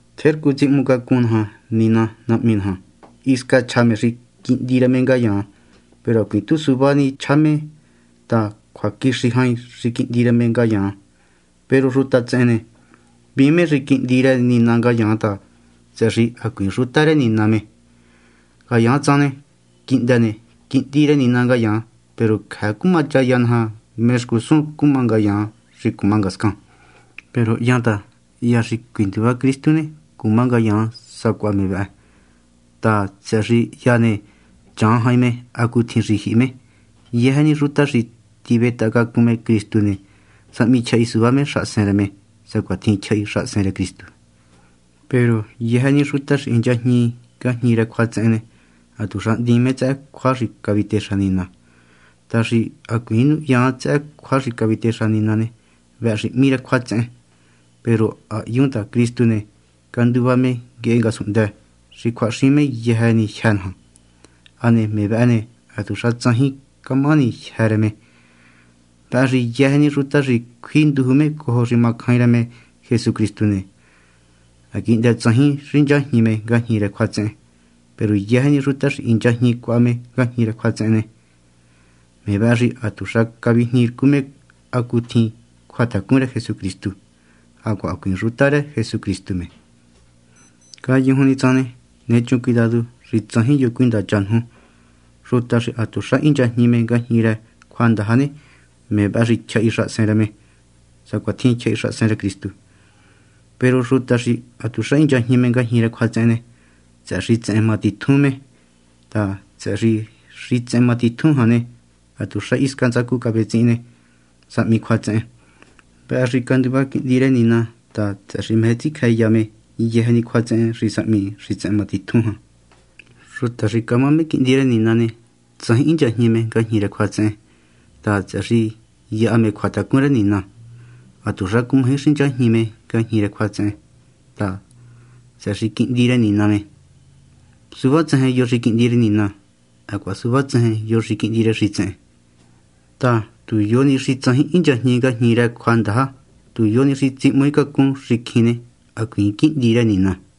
Tjercu tsihmucacun naja Nina Nahmi naja. Hisca chja me xi quihndi rë me ngayaan. Peru hacuiin tu suvá chja ni me ta cjuaquixi jain xi quihndi rë me ngayaan. Peru xuta tsehen ne, hvíin me xi quihndi rë Nina ngayaan ta, tsëhë xi hacuiin xuta rë Nina me. Ngayaan tsan ne, quihndë ne, quihndi rë Nina ngayaan. Peru cjëë cumachaya naja mé xcusun xuta cuma ngayaan xi cuma ngascan. Peru ha hyan ta, hya xi cuinduva Cristu ne, cuma ngayaan sacuaha me vëhë ta, tsëhë xi hya ne, chan jain me hacutjin xi jyihi me. Yëjë ni xuta xi tivetahacacun me Cristu ne, sahmi tyjahi suvá me xahasen rë me, sacuatjin tyjahi xahasen rë Cristu. Peru yëjë ni xuta xi hinchajñi ngajñi rë cjuatsehen ne, hatuxa hndiin me tsëhë cjua xi cavitexa Nina. Ta xi hacuiin nuhyaan tsëhë cjua xi cavitexa Nina ne, vëhë xi hmí cjuatsehen. Peru ha hyun ta Cristu ne, canduva me nguehe ngasunhndë, xi cjuahaxin me yëjë ni jyë́ naja. Hane me vëhë ne, hatuxa tsajin camahani jyë́ rë me. Vëhë xi yëjë ni xuta xi cjui nduju me cojo xi macjain rë me Jesucristu ne, ha quihndë tsajin hinchajñi me ngajñi rë cjuatsehen. Peru yëjë ni xuta xi hinchajñi cuaha me ngajñi rë cjuatsehen ne, me vëhë xi hatuxa cavijniircu me hacutjin cjuatacun rë Jesucristu, hacuaha hacuiin xuta rë Jesucristu me. Ngayujun ni tsan ne, nechun cuidadu xi tsajin yo cuindacha nuju. Xuta xi hatuxa hinchajñi me ngajñi rë cjuandaja ne, me vëhë xi tyjahi xahasen rë me, sacuatjin tyjahi xahasen rë Cristu. Peru xuta xi hatuxa hinchajñi me ngajñi rë cjuatsehen ne, tsëhë xitsehen matitjun me ta, tsëhë xi xitsehen matitjun jan ne, hatuxa hisca ntsacu cavetsihin ne, sahmi cjuatsehen. Vëhë xi canduva Quihndi rë Nina ta, tsëhë xi meje tsicjëya me yëjë ni cjuatsehen xi sahmi xitsehen matitjun jan. Xuta xi camá me quihndi rë Nina ne, tsajin hinchajñi me ngajñi rë cjuatsehen ta, tsëhë xi yaha me cjuatacun rë Nina. Hatuxa cumaji xinchajñi me ngajñi rë cjuatsehen ta, tsëhë xi quihndi rë Nina me. Suvá tsejen yo xi quihndi rë Nina, hacuaha suvá tsejen yo xi quihndi rë xitsehen. Ta tu yo ni xi tsajin hinchajñi ngajñi rë cjuandaja, tu yo ni xi tsihmaaicacun xicjin ne, hacuiin quihndi rë Nina.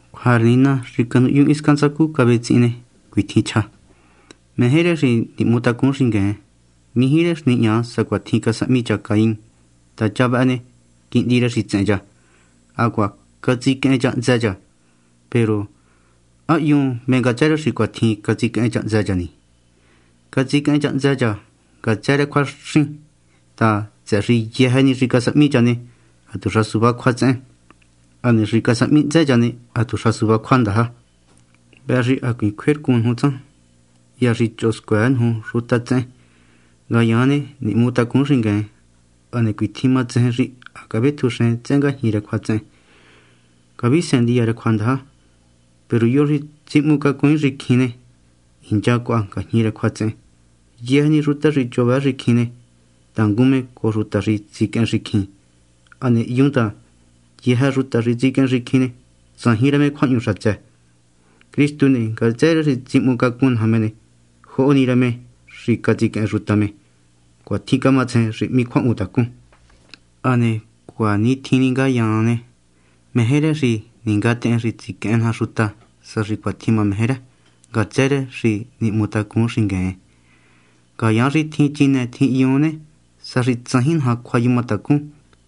Cjua rë Nina xi canuhyun hisca ntsacu cavetsihin ne, cuitjin chja: meje rë xi nihmutacun xingueen. Mijí rë xi nihña sacuatjin casahmi cha Caín ta cha vëhë ne, quihndi rë xitsehen cha, hacuaha catsiquehen cha hntsë cha. Peru ¿há hyun mé ngatsë rë xi cuatjin catsiquehen cha hntsë cha ni? Catsiquehen cha hntsë cha ngatsë rë cjuaxin ta, tsëhë xi yëjë ni xi casahmi cha ne, hatuxa suvá cjuatsehen, hane xi casahmi hntsë cha ne, hatuxa suvá cjuandaja. Vëhë xi hacuiin cjuercun nuju tsan, hya xi choho scuëë nuju xuta tsehen. Ngayaan ne, nihmutacun xingueen. Hane cuatjin matsejen xi ha cavetjunxen tsëhë ngajñi rë cjuatsehen, caviseen ndiya rë cjuandaja. Peru yo xi tsihmaaicacun xicjin ne, hincha cuaha ngajñi rë cjuatsehen. Yëjë ni xuta xi choho vëë xicjin ne, tangun me cojo xuta xi tsiquehen xicjin. Hane ha hyun ta, yëjë ni xuta xi tsiquehen xicjin ne, tsajin rë me cjuahñu xatsë. Cristu ne, ngatsë rë xi tsihmucacun naja me ne, joho ni rë me xi catsiquehen xuta me. Cuatjin camatsejen xi hmí cjuahmutacun. Hane hacuatjin ngayaan ne, meje rë xi ningatehen xi tsiquehen naja xuta, sa xi cuatjin mameje rë, ngatsë rë xi nihmutacun xingueen. Ngayaan xi tjin chinë tjin hyun ne, sa xi tsajin naja cjuayumatacun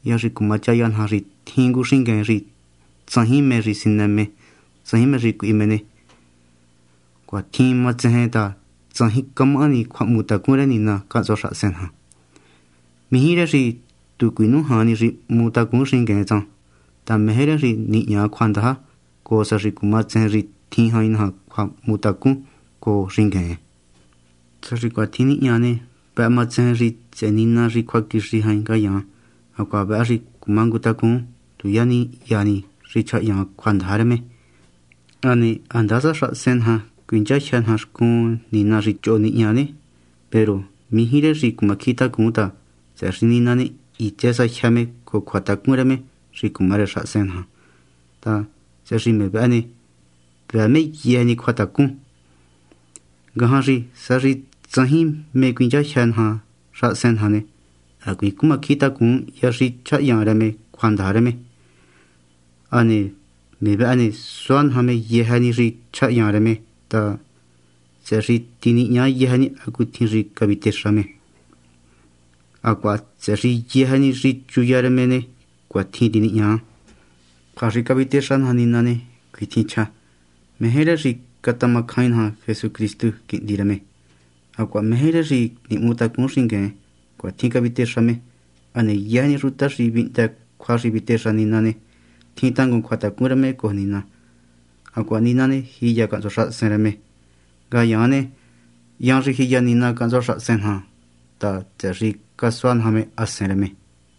hya xi ma chaya naja xi tjin ngu xingueen xi tsajin mé sinë me tsajin mé cuihi me ne, cuatjin matsejen ta tsajin camahani cjuahmutacun rë Nina cahntsua xahasen naja. Mijí rë xi tu cuinújan ni xi nihmutacun xingueen tsan ta meje rë xi nihña cjuandaja, cojo sa xi cumatsejen xi tjin jain naja cjuahmutacun cojo xingueen. Sa xi cuatjin nihña ne, vëhë matsejen xi tsëhë Nina xi cjuaquixi jain ngayaan, hacuaha vëhë xi cumangutacun tu ya ni ni hya xi chjahyan rë me cjuandaja rë me. Hane ha ndasa xahasen naja cuinchajyë naja xcun Nina xi choho nihña ne, peru mijí rë xi cumacjintacun ta, tsëhë xi Nina ne, hitsë sa jyë me cojo cjuatacun rë me xi cumá rë xahasen naja ta, tsëhë xi me vëhë ne, vëë me yëjë ni cjuatacun. Ngajan xi sa xi tsajin mé cuinchajyë naja xahasen naja ne, hacuiin cumacjintacun hya xi chjahyan rë me cjuandaja rë me. Hane me vehe ne, sua naja me yëjë ni xi chjahyan rë me ta, tsëhë xi tinihña yëjë ni hacutjin xi cavitexa me, hacuaha tsëhë xi yëjë ni xi chuya rë me ne, cuatjin tinihña. Cjua xi cavitexa naja Nina ne, cuitjin chja: meje rë me xi catamacjain naja Jesucristu, Quihndi rë me, hacuaha meje rë me xi nihmutacun xingueen. Cuatjin cavitexa me. Hane yëjë ni xuta xi vihndë cjua xi cavitexa Nina ne, tjin tangun cjuatacun rë me cojo Nina, hacuaha Nina ne, jiya cahntsua xahasen rë me. Ngayaan ne, hyan xi jiya Nina cahntsua xahasen naja ta, tsëhë xi casua naja me Hasen rë me.